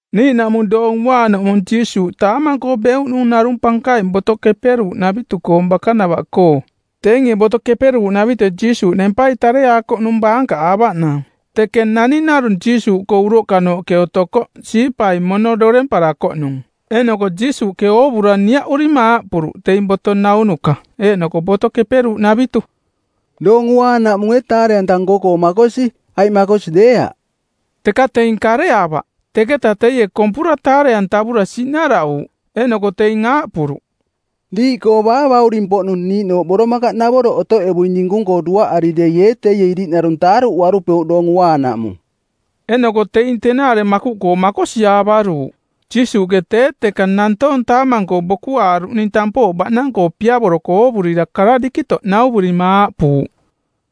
Niiꞌnaꞌmung Doong Uaanaꞌmung Jiisuuꞌ taamang-koo beuꞌnung narung pankaing Boto Keperuuꞌnavitu-koong bakanavaꞌkoo. Teinge Boto Keperuuꞌnavitue Jiisuuꞌ nempai tareaakoꞌnung baankaꞌaavaꞌnaang. Teke naning narung Jiisuuꞌkoo uroꞌkanooꞌke otokoꞌ siipai mono doremparakoꞌnung. Eeꞌnoko Jiisuuꞌke oovura niaꞌurima aaꞌpuruꞌ teing boto naunuka eeꞌnoko Boto Keperuuꞌnavitu, “Doong Uaanaꞌmung ee taare-anta nko-koo makosi aiꞌ makosi deeaꞌ?” Teka teing kareaavaꞌ. Teketaꞌ teie kompura taare-antavura siꞌnaraꞌuuꞌ. Eeꞌnoko teing aaꞌpuruꞌ, “Diiꞌkoo baa bauring-poꞌnung niiꞌnooꞌ boromakaꞌnavoroꞌ otoꞌevuing dinkung-koo duaꞌari dei ee teie iriꞌnarung taaruꞌuarupeuꞌ Doong Uaanaꞌmung?” Eeꞌnoko teing tenaare makuꞌkoo makosiaavaruuꞌ. Jiisuuꞌke tee teka nantoong taamang-koo bokuaaruꞌning tampooꞌ baꞌnang-koo piavoroko oovurira kara dikitoꞌ nauvurima aaꞌpuuꞌ,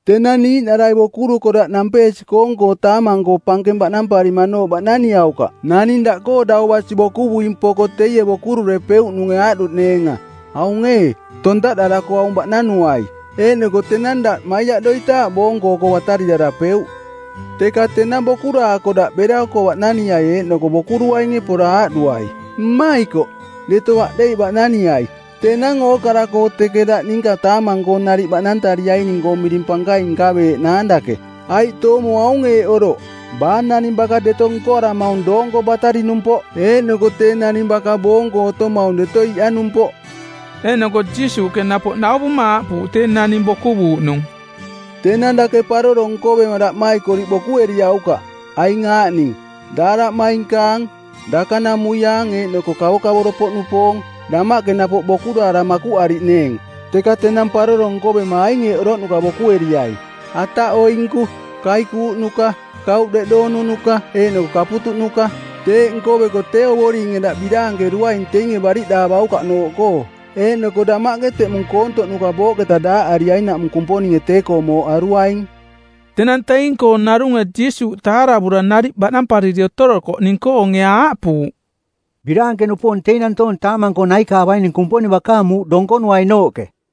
“Tenang niiꞌnarai bokuruko daꞌ nampeesi-koong-koo taamang-koo pankeng baꞌnamparimanooꞌ baꞌnaniaukaꞌ naning daꞌkoo dau basi bokuvuing poko teie bokururepeuꞌnunge aaꞌduꞌneenga, ‘Aung ee, tontaꞌdarako aung baꞌnanuai;’ Eeꞌnoko tenang daꞌ maiaꞌdoitaaꞌ boonko oko batariꞌdarapeuꞌ. Teka tenang bokuraako daꞌ bera oko baꞌnaniai, eeꞌnoko bokuruinge pora aaꞌduai, ‘Mmaikoꞌ, deto aꞌdeiꞌ baꞌnaniai.’ Tenang ookara-koo teke daꞌ ninka taamang-koo nariꞌ baꞌnantariaining-koo miring pankaing nkaveeꞌnaang dake. Aiꞌ toomo aung eeꞌ oroꞌ: Baa naning baka deto nkoaramaung doonko batariꞌnumpoꞌ eeꞌnoko tee naning baka boonko otomaung deto iꞌanumpoꞌ.” Eeꞌnoko Jiisuuꞌke napoꞌ nauvuma aaꞌpuuꞌ tee naning bokuvuuꞌnung, “Tenang dake paroro nkovema daꞌmaikoriꞌ bokueriaukaꞌ, aing aaꞌning: daaraꞌmainkaang, dakanamuiaang eeꞌnoko kavokavoro-poꞌnupoong, damaꞌke napoꞌ bokuraara makuꞌariꞌneeng. Teka tenang paroro nkovema aing eeꞌ oroꞌnuka bokueriai: ataꞌoinku, kaikuuꞌnuka, kauꞌ deꞌdoonuka eeꞌnoko kaputuꞌnuka. Teeꞌ nkoveko tee Ovoringe daꞌ biraankeruaing teinge bariꞌdaavaukaꞌnooꞌkoo, eeꞌnoko damaꞌke teꞌmung koontoꞌnuka booꞌketa daaꞌariainaꞌmung Kumponinge tee-koo mooꞌ aruaing.” Tenang teing-koo narunge Jiisuuꞌ taaravura nariꞌ baꞌnampariri otorokoꞌning-koonge aaꞌpuuꞌ, “Biraanke-nupoong teing nantoong taamang-koo naikaavaining Kumponing bakaang muuꞌ donkonuainooꞌke.”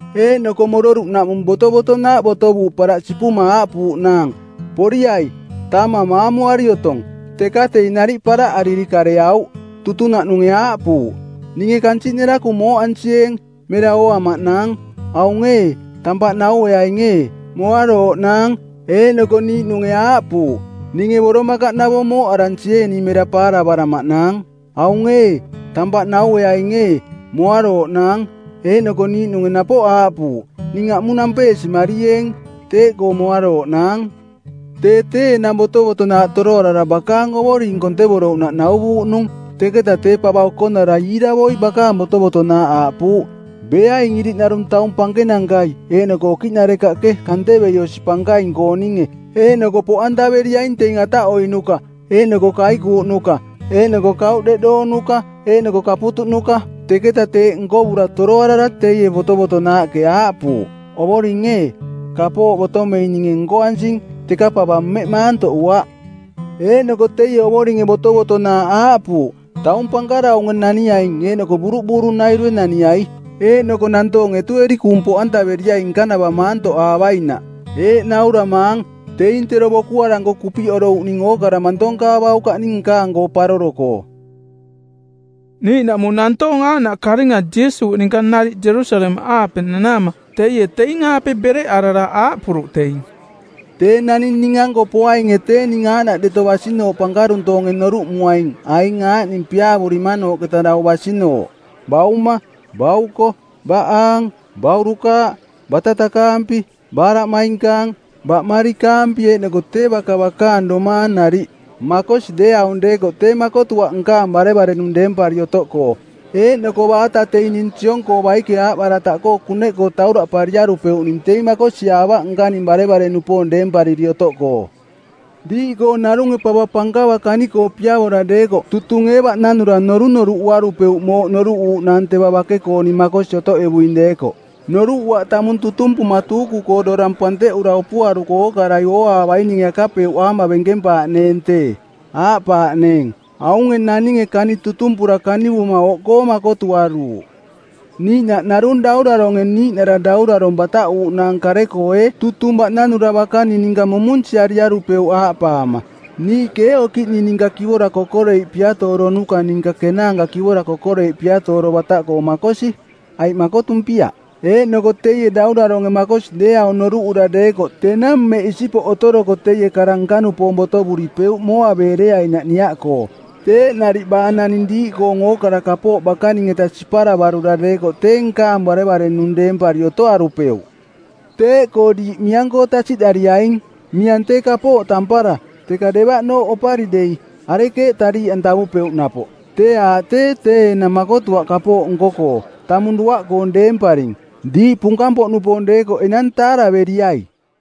Eeꞌnoko mororuꞌnaꞌmung botovotonaaꞌ botovuuꞌ paraꞌ sipuma aaꞌpuuꞌnaang, ‘Poriai, taamang maamuari otong.’ Teka teing nariꞌ paraꞌariri kareauꞌ. Tutunaꞌnunge aaꞌpuuꞌ, ‘Ninge kansiꞌ nerakung mooꞌansieeng; mera ooamaꞌnaang. Aung ee, tampaꞌ naueaing ee, moarooꞌnaang.’ Eeꞌnoko niiꞌnunge aaꞌpuuꞌ, ‘Ninge boromakaꞌnavong mooꞌaransieening mera paaravaramaꞌnaang. Aung ee, tampaꞌ naueaing ee, moarooꞌnaang.’ Eeꞌnoko niiꞌnunge napoꞌ aaꞌpuuꞌ, ‘Ning aꞌmung nampeesimarieeng; teeꞌkoo moarooꞌnaang.’ “Tee tee enang botovotonaaꞌ toroarara bakaang ovoring kontevorouꞌnaꞌ nauvuuꞌnung. Teketaꞌ tee pava okonara iiravoi bakaang botovotonaaꞌ aaꞌpuuꞌ, ‘Beaing iriꞌnarung taung pankenankai eeꞌnoko okiꞌnarekaꞌke kantevei osi pankaing-kooninge eeꞌnoko poꞌantaveriaing teing ataꞌoiꞌnuka eeꞌnoko kaikuuꞌnuka eeꞌnoko kauꞌ deꞌdoonuka eeꞌnoko kaputuꞌnuka.’ Teketa teeꞌ nkovura toroarara teie botovotonaaꞌke aaꞌpuuꞌ, ‘Ovoring ee, kapooꞌ botomeing ninge nkoansing, teka pava mmeꞌ maantoꞌuaꞌ.’ Eeꞌnoko teie ovoringe botovotonaaꞌ aaꞌpuuꞌ, ‘Taung pankaraunge naniaing eeꞌnoko buruꞌbuurunairue naniai. Eeꞌnoko nantoong etueri kuung poꞌantaveriai nkanava maantoꞌaavainaꞌ. Eeꞌ nauramaang, teing tero bokuaranko kupiꞌorouꞌning ookara mantonkaavaukaꞌning nkaang-koo paroro-koo.’” Niiꞌnaꞌmung nantoong aaꞌnaꞌ karinga Jiisuuꞌ ninka nariꞌ Jerusalemaꞌaape nanaama teie teing-aape bereꞌarara aaꞌpuruꞌ teing, “Tee naning ning-anko poainge tee ning aaꞌnaꞌ deto basinooꞌ pankaruntoonge noruꞌmuaing aing aaꞌning piaavurimanooꞌketa dau basinooꞌ: bauma, bauko, baꞌaang, baurukaaꞌ, batatakaampi, baaraꞌmainkaang, baꞌmarikaampi eeꞌnoko tee baka bakaang domaang nariꞌ. Makosi deeaung deekoꞌ tee makotuaꞌ nkaang barevare-nung deempari otoꞌkoo. Eeꞌnoko baata teing ning siong-koo baike aaꞌbarataꞌkoo kuneꞌkoo tauraꞌpariarupeuꞌning teing makosiaavaꞌ nkaning barevare-nupoong deempariri otoꞌkoo. “Diiꞌkoo narunge pava pankava kani-koo piavora deekoꞌ tutung ee baꞌnanura norunoruꞌuarupeuꞌ mooꞌ noruꞌuuꞌnaang teva bake-kooning makosi otoꞌevuing deekoꞌ. Noruꞌuaꞌ tamung tutumpuma tuuku-koo dorang panteꞌura opuaruko ookarai ooaavaininge akapeuꞌaama bemkempaaꞌneeng tee. Aaꞌpaaꞌneeng, ‘Aunge naninge kani tutumpura kanivuma oꞌkoo makotuaruuꞌ.’ “Niiꞌnaꞌ narung dauraronge niiꞌnara daurarong˜ bataꞌuuꞌnaang kare-koo ee tutung baꞌnanura bakaning ninka mumunsiariarupeuꞌ aaꞌpaama, ‘Niiꞌke ee okiꞌning ninka kivora kokoreiꞌ piatooronuka ninka kenaanka kivora kokoreiꞌ piatooro bataꞌkoo makosi, aiꞌ makotumpiaꞌ?’ Eeꞌnoko teie dauraronge makosi deeaung noruꞌura deekoꞌ tenang mmeꞌ isipoꞌ otoroko teie kara nka-nupoong botovuripeuꞌ mooaveereainaꞌ niaꞌkoo. Teeꞌ nariꞌ baa naning diiꞌkoong ookara kapooꞌ bakaning-eta siparavarura deekoꞌ tee nkaang barevare-nung deempari otoarupeuꞌ.” “Teeꞌkoo diiꞌ miang-koo tasiꞌdariaing. Miang tee kapooꞌ tampara, teka devaꞌnooꞌ opari dei, arekeeꞌ tariiꞌantavupeuꞌ napoꞌ? Tee aaꞌ tee tee enang makotuaꞌ kapooꞌ nko-koo, tamung duaꞌkoong deemparing. “Diiꞌ punkang-poꞌnupoong deekoꞌ enang taaraveriai!”